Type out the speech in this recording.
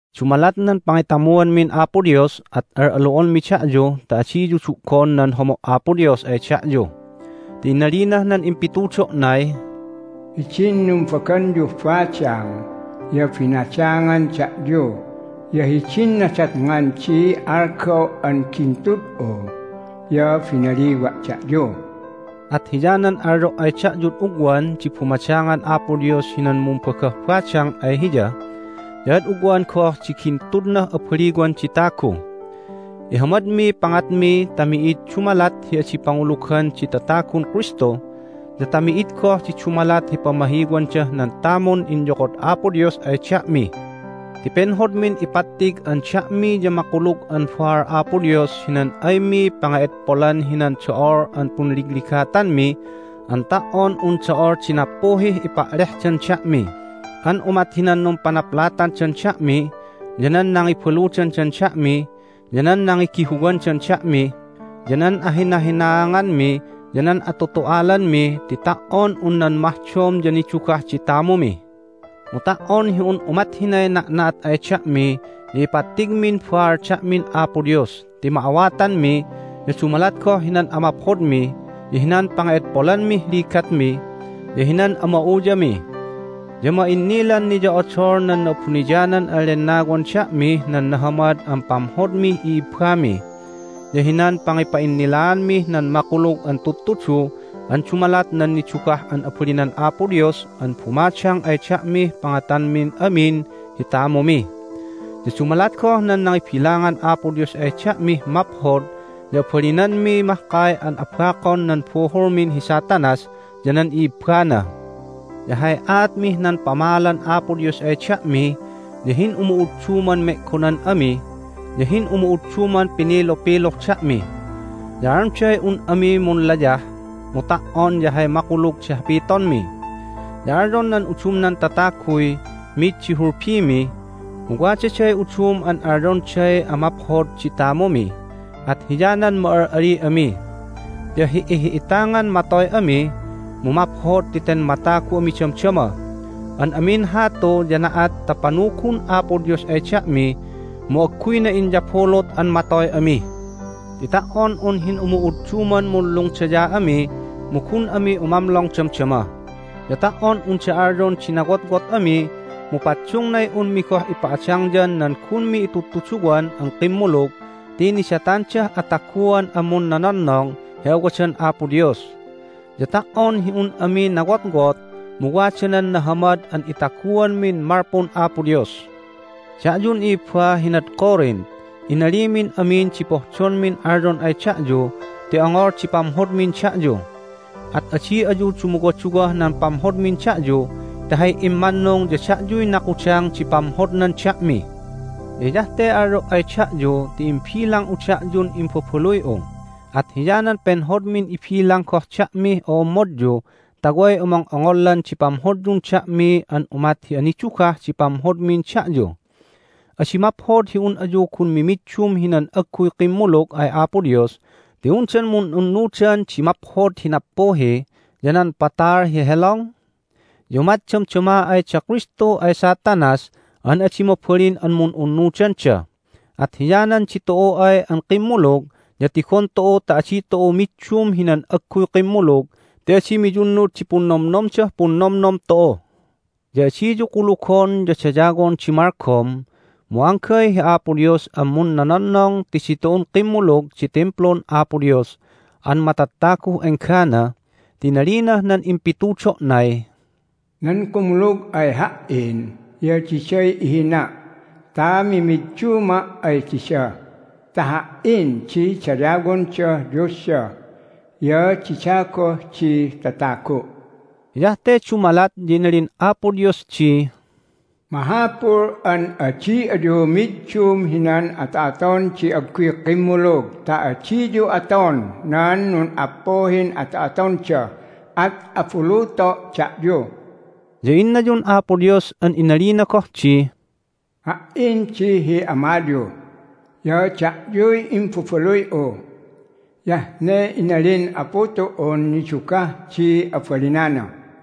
Dumalat nan pangitamuanmin Apo Dios at al'alu'onmi da'yu ta adiyu du'gon nan homo' Apo Dios ay da'yu! Ti inalinah nan impitudo'nay, "Hidin numbaganyuh badang ya binadangan da'yu, ya hidin nadatngan di algaw an gintud'u ya binaliwa' da'yu." At hiyanan alyo' ay da'yud ugwan di bumadangan Apo Dios hinan mumbagah badang ay Hiya, ya ad ugwan goh di gintudnah abaliwan di tagu. Ihamadmiy pangatmi ta mi'id dumalat hi adi pangulugan di tatagun Kristu ya ta mi'id goh di dumalat hi pamahiwandah nan tamun inyokod Apo Dios ay da'mi. Ti penhodmin ipattig an da'mi ya makulug an baal Apo Dios hinan aymi pange'edpolan hinan do'ol an punligligatanmi an ta"on un do'ol di nappuhih epa'lehdan da'mi an umat hinan numpanaplatandan da'mi, ya nan nangibaludandan da'mi, ya nan nangigihuwandan da'mi, ya nan ahinahinaanganmi, ya nan atutu'alanmi ti ta"on un nan mahdom ya nidugah di tamumi. Mu ta"on hi un umat hinay na'na'at ay da'mi ya ipattigmin baal da'min Apo Dios ti ma'awatanmi, ya dumalat goh hinan amaphodmi, ya hinan pange'edpolanmih ligatmi, ya hinan ama'uyami. Ya ma'innilan niyo'odol nan Na'abuniyanan an Lennawan da'mih nan nahamad an pamhodmih i'ibbami, ya hinan pangipa'innilaanmih nan makulug an tudtudu an dumalat nan nidugah an abalinan Apo Dios an bumadang ay da'mih pangatanmin amin hi tamumi. Ya dumalat goh nan nangibilangan Apo Dios ay da'mih maphod ya abalinanmi mahkay an abakon nan buhulmin hi Satanas ya nan i'ibbana. Ya hay aatmih nan pamaalan Apo Dios ay da'mi ya hin'umu'udduman me'gonan ami, ya hin'umu'udduman pinilupiluh da'mi. Ya alyonday un ami munlayah, mu ta"on ya hay makulug di hapitonmi. Ya alyon nan udumnan tataguy mid di hulbimi, mu wadaday udum an alyonday amaphod di tamumi, at hiyanan ma'al'ali ami. Ya hi'ihi'itangan matoy ami, mu maphod ti ten matagu ami damdama. An amin hatu ya na'at ta panugun Apo Dios ay da'mi, mu agguyna inyabulut an matoy ami. Ti ta"on un hin'umu'udduman munlungdaya ami mu gun ami umamlong damdama. Ya ta"on unda alyon di nawotwot ami mu paddungnay unmi goh ipa'adangyan nan gunmi intudtuduwan an kimmulug ti nidatandah ataguan an munnononnong hi awadan Apo Dios. Ya ta"on hi un ami nawotwot mu wada nan nahamad an itaguanmin malpun Apo Dios. Da'yun i'ibba hinad Corinth, inalimin amin di pohdonmin alyon ay da'yu ti ongol di pamhodmin da'yu. At adi ayu dumuwaduwah nan pamhodmin da'yu ti hay immannung ya da'yuy nakudang di pamhodnan da'mi. Ya hiyah te alyo' ay da'yu ti imbilang'u da'yun imbabaluy'u, at hiyanan penhodmin ibilang goh da'mih o'ommodyu ta way omong'ongollan di pamhodyun da'mi an umat hi anidugah di pamhodmin da'yu. Adi maphod hi un ayu gun mimiddum hinan agguy kimmulug ay Apo Dios ti undan mun'unnudan di maphod hi nappuhi, ya nan patal hi helong? Ya umat damdama ay da Kristu ay Satanas an adi mabalin an mun'unnudanda. At hiyanan ditu'u ay an kimmulug ya tigon tu'u ta adi tu'u middum hinan agguy kimmulug ti adi miyunnud di punnomnomdah punnomnom tu'u. Ya adiyu kulugon ya dayawon di malgom, mu anggay hi Apo Dios an munnononnong ti ditu'un kimmulug di Timplun Apo Dios an matattaguh enggana, ti inalinah nan impitudo'nay, "Nan kumulug ay Ha"in ya diday ihina' ta mimidduma' ay dida ta Ha"in di dayawondah Diosda, ya dida goh di tatagu'." Hiyah te dumalat ya inalin Apo Dios di, "Mahapul an adi ayu middum hinan ato'aton di agguy kimmulug ta adiyu aton nan nun'appuhin ato'atonda, at abuluto' da'yu." Ya innayun Apo Dios an inali goh di, "Ha"in di hi Amayu, ya da'yuy imbabaluy'u. Hiyah ne inalin Apu tu'un nidugah di abalinana."